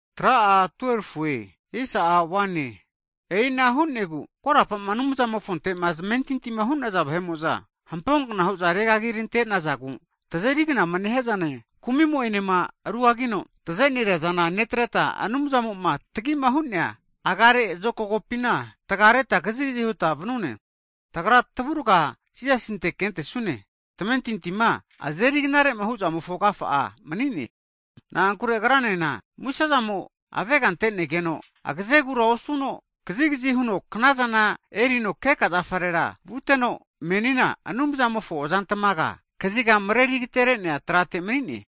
Hagi e'i ana hu'negu korapama Anumzamofontema zamentintima hu'naza vahe'mo'za, hamponkna hu'za regagirantenazagu, tazeri knama nehia zane, kumimo'enema rugagino tazeneria zana netreta, Anumzamo'ma tagima hu'nea agamareno tragi zokagopina tagareta kazigazi huta vanune. Tagra tavuraga Jisasinte kentesune, tamentintima azeri knarema huzamofo agafa'a mani'ne. Na'ankure Agranena musezamo avega'antenegeno, agazegura osuno kazigazi huno knazana erino keka zafarera vuteno, menina Anumzamofo azantamaga kaziga mareri agaterenea tratera mani'ne.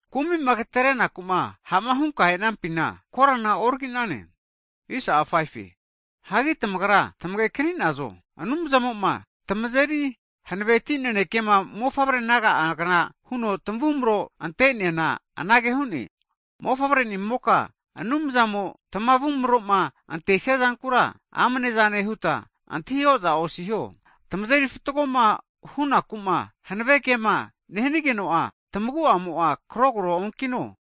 Kumi'ma agaterenaku'ma hama hutama e'nafina, korana oraginaze. Hagi tamagra tamagekaninazo, Anumzamo'ma tamazeri hanaveti nanekema mofavre naga'agna huno tavumaroma anteneana anage hu'ne, Mofavrenimoka Anumzamo'ma tamavumaroma antesia zankura amnezane huta antahi oza osiho, tamazeri fatgoma hunaku'ma hanave kema nehanigeno'a tamagu'amo'a kragogo onkino.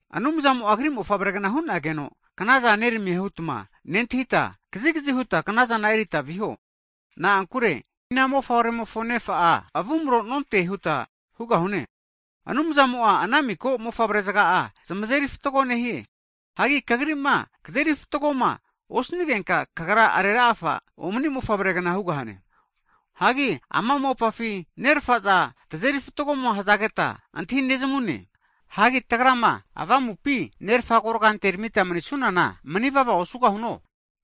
Anumzamo'a Agri mofavregna hu'nageno knazana neramie hutma nentahita kazigazi huta knazana erita viho. Na'ankure ina mofavremofo nefa'a avumrora nonte huta hugahune. Anumzamo'a ana miko mofavre zaga'a zamazeri fatgo nehie. Hagi kagrima kazeri fatgoma osanigenka, kagra nerera'ene nefa omani mofavregna hugahane. Hagi ama mopafi nerafaza tazeri fatgoma hazageta antahinezamune. Hagi tagrama avamupi, Nerafa agorga anteramita manisunana manivava osugahuno?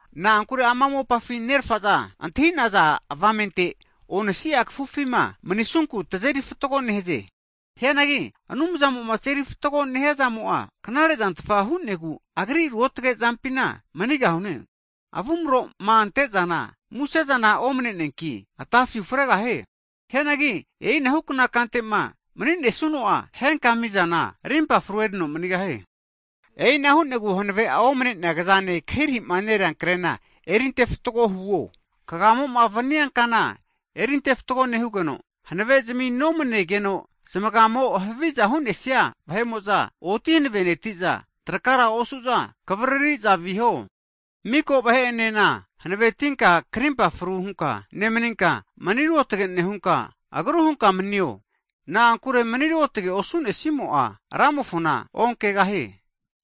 Na'ankure ama mopafi nerafaza antahi'naza avamente onasia kafufima manisunku tazeri fatgo nehaze. Hianagi Anumzamoma tazeri fatgoma nehia zamo'a knare'zantfa hu'negu, Agri ruotage zampina manigahune. Avumroma antezana musezana omane'neanki atafi ufregahie. Hianagi e'inahukna kantema maninesuno'a, henka mizana arimpa fru erino manigahie. E'ina hu'negu hanave'a omanea kazane kahirahima nerea krena erinte fatgo huo. Hagi kagamoma vania kana erintefatgo nehugeno, hanavezmi nomanegeno zamagamo haviza hu'nesia vahe'mo'za, oti hanavenetiza trakara osu'za kavaririza viho. Miko vahe'enena hanavetinka karimpa fru hunka nemaninka, mani ruotage nehunka, agru hunka manio. Na'ankure mani ruotage osunesimo'a Ramofona onkegahie.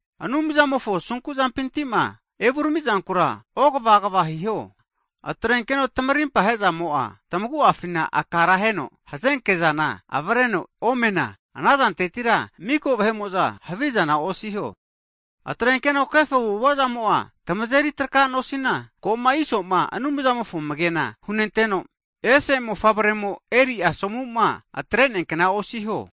Anumzamofo asunkuzampintima evuramizankura ogava agava hiho. Atrenkeno tamarimpa hezamo'a, tamagu'afina akara heno hazenkezana avreno omena, anazantetira miko vahe'mo'za havizana osiho. Atrenkeno kefo avu'avazamo'a tamazeri traka nosina, koma Isoma Anumzamofo amagena hunenteno, ese mofavremo eri asomuma atreneakna osiho.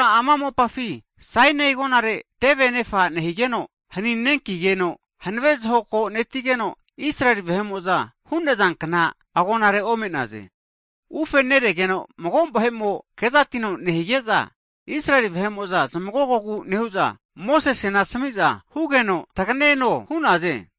Tamagra ama mopafi Sainai agonare teve anefa nehigeno, haninenkigeno, hanave zahoko netigeno, Israeli vahe'mo'za hu'nazankna agonare ome'naze. Ufeneregeno, mago vahe'mo kezatino nehige'za, Israeli vahe'mo'za zamagogogu nehu'za, Mosesena asamiza hugeno taganeno hu'naze.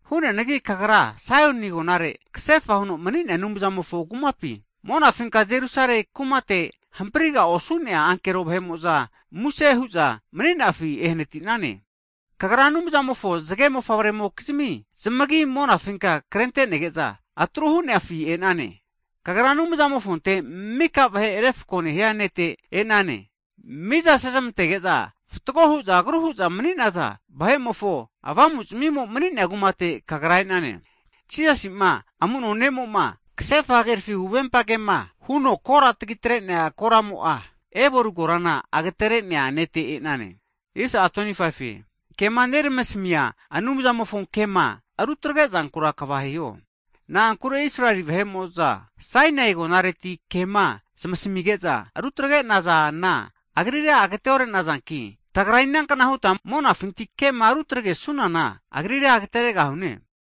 Hu'neanagi kagra ko Saioni agonare, kasefa huno mani'nea Anumzamofo kumapi monafinka Jerusalemi kumate, hampriga osu'nea ankero kevumo'za muse hu'za mani'nafi ehanatinane. Hagi kagra Anumzamofo zage mofavremokizmi zamagi'a monafinka krentenege'za atru hu'nafi e'nane. Kagra Anumzamofonte mika vahe refko nehia Nete e'nane. Miza sezamantege'za fatgo huza agru huza mani'naza vahe'mofo avamuzmimo mani'nea kumate kagra e'nane. Jisasi'ma amuno ne'mo'ma kasefa hagerafi huvempa kema huno kora tagitre'nea koramo'a, Ebeli korana agaterenea Nete e'enane. Hagi kema neramasamia Anumzamofo kema rutregezankura kava hiho. Na'ankure Israeli vahe'mo'za Sainai agonareti kema zamasamige'za rutagre'nazana Agrira agate'orenazanki, tagra ina'kna huta monafinti kema rutragesunana Agrira agateregahune?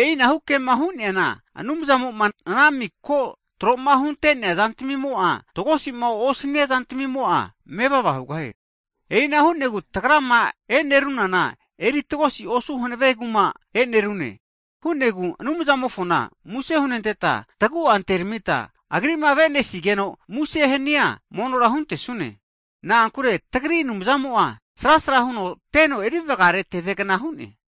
E'inahu kema hu'neana, Anumzamo'ma ana miko tro'ma hunte'nea zantamimo'a tagosi hanigeno, tagosi'ma osania zantamimo'a mevava hugahie. E'ina hu'negu tagrama e'neruna kumara eri tagosi osu hanavenentake kuma e'nerune. Hu'negu Anumzamofona muse hunenteta, tagu'a anteramita Agri'ma avesinigeno muse hania mono huntesune. Na'ankure tagri Anumzamo'a srasra huno teno erivagare tevegna hu'ne.